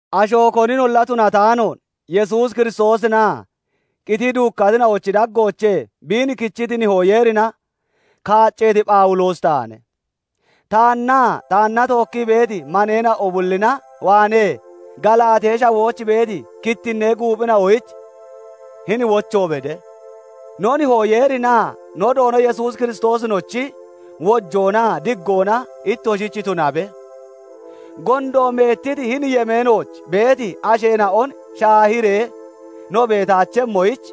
Asho koninolla tunataanoon Yesuus Kiristoosinaa qitii duukkatina'ochi daggoochee biin kichiti Nihoo Yeerina kaacceeti Phawuloosi taane. Taannaa taanna tookkii beeti maneena'o bullina waanee Galaatee Shawooch beeti kittinnee guuphina'oyich hini wocho bede. No Nihoo Yeerinaa no Doono Yesuus Kiristoosinochi wojoonaa diggoona ittoshich tunabe. Gondo meettiti hini yemeenooch beeti asheena'on shaahiree no beetaachemmoyich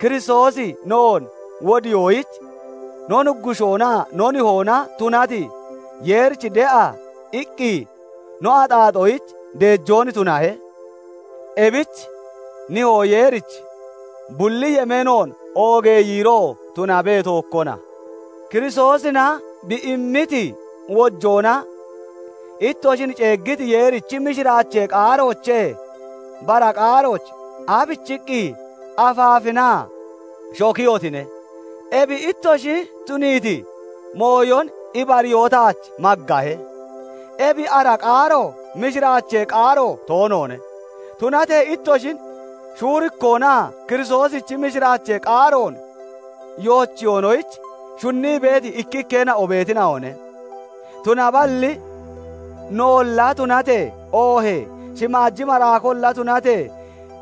Kiristoosi noon wodiyoyich no Nuggushoonaa no Nihoona tunati Yeerich de'a iqqi no axaaxoyich deejoon tunahe. Ebich Nihoo Yeerich bulli yemeenoon oogee yiiroo tunabe; tookkona. Kiristoosina bi immiti wojoona ittoshin ceeggiti Yeerichi mishiraachee qaaroochee bara qaarooch aabichiqqi afaafinaa shokiyotine? Ebi ittoshi tuniiti mooyon ibariyoo taach maggahe. Ebi ara qaaro mishiraachee qaaro toonoone. Tunatee ittoshin shuurikkoonaa Kiristoosichi mishiraachee qaaroon yoochiyonoyich shunnii beeti ikkikkeena'o beetina'one. Tunaballi noolla tunatee, oohee shimaaji maraakolla tunatee,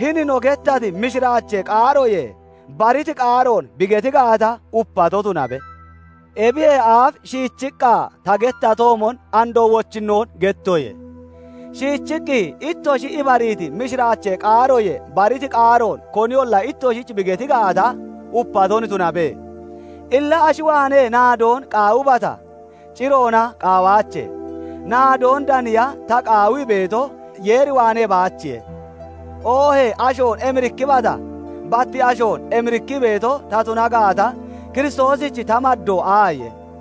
hini no gettati mishiraachee qaaroyee bariti qaaroon bi geti gaata, upaton tunabe! Ebiyee aaf shiichiqqa ta gettatoomon andoo wochinnoon gettoye; shiichiqqi ittoshi ibariiti mishiraachee qaaroyee bariti qaaroon koniyolla ittoshich bi geti gaata, upaton tunabe! Illa ashi waanee naadoon qaawibata? Ciroona qaawaache; naadoon daniya ta qaawii beeto, Yeer waanee baachiye. Oohee ashoon emirikkibata? Bat ashoon emirikkii beeto ta tuna gaata, Kiristoosich ta maddoo aaye?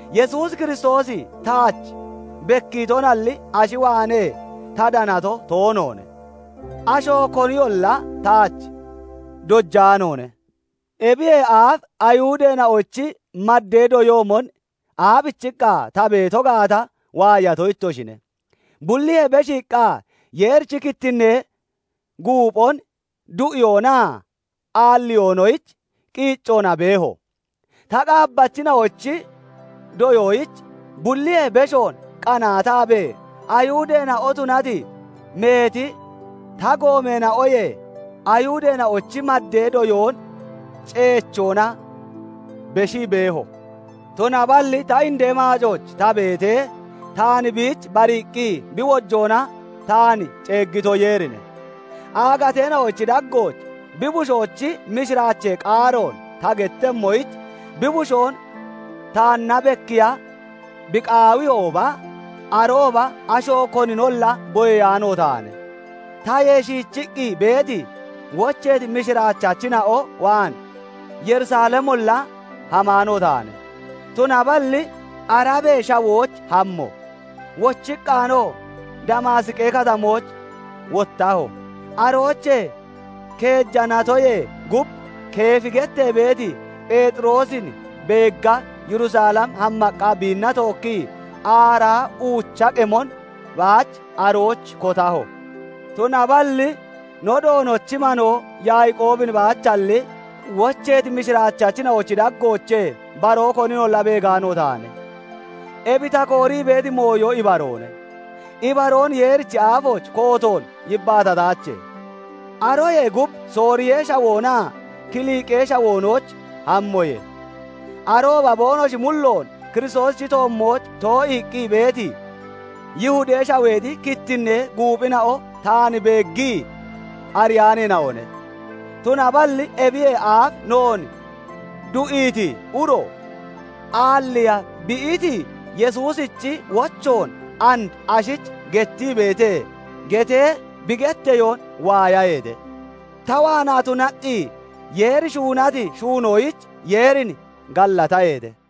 Yesuus Kiristoosi taach bekkiitoalli, ashi waanee ta danato toonoone; asho koniyolla taach dojaanoone. Ebiyee aaf Ayihudeena'ochi maddee doyoomon aabichiqqa ta beeto gaata waayato ittoshine; bulliyee beshiiqqa Yeerichi kittinnee guuphon du'iyoonaa aalliyoonoyich qiiccoona beeho. Ta qaabbachina'ochi doyoyich bulliyee beshoon qanaataabee Ayihudeena'o tunati meeti ta goomeena'oyee Ayihudeena'ochi maddee doyoon ceechoona beshii beeho. Tunaballi ta indee maacooch ta beetee taan biich bariiqqi bi wojoona taan ceeggito Yeerine; aagateena'ochi daggooch bi Bushoochi mishiraachee qaaroon ta gettemmoyich, bi Bushoon taanna bekkiiya bi qaawiyooba, arooba asho koninolla boyeyaano taane. Tayee shiichiqqi beeti, wocheeti mishiraachachina'o waan Yerusalemolla hamaano taane; tunaballi Arabee Shawooch hammo; wochiqqaanoo Damaasiqi Katamooch wottaho. Aroochee keeja natoyee gub Keefi gettee beeti Pheexiroosin beegga Yerusalem hammaqqa biinna tookkii aaraa uucha qemon baach arooch kotaho. Tunaballi no Doonochi manoo Yaaqoobin baachalli, wocheeti mishiraachachina'ochi daggoochee baroo koninolla beegaano taane. Ebi ta koorii beeti mooyo ibaroone; ibaroon Yeerichi aafooch kootoon yibbaatataache. Aroyee gub Sooriyee Shawoonaa Kilqee Shawoonooch hammoye. Arooba boonoshi mulloon Kiristoosichi toommooch too'iiqqi beeti, Yihudee Shaweexi kittinnee guuphina'o taan beeggii ariyaaneena'one. Tunaballi "Ebiyee aaf noon du'iiti uro, aalliiya bi iiti Yesuusichi wochoon and ashich gettii beete" getee bi getteyoon waayaheete; ta waanaa tunaqqi Yeeri shuunati shuunoyich Yeerin gallataheete.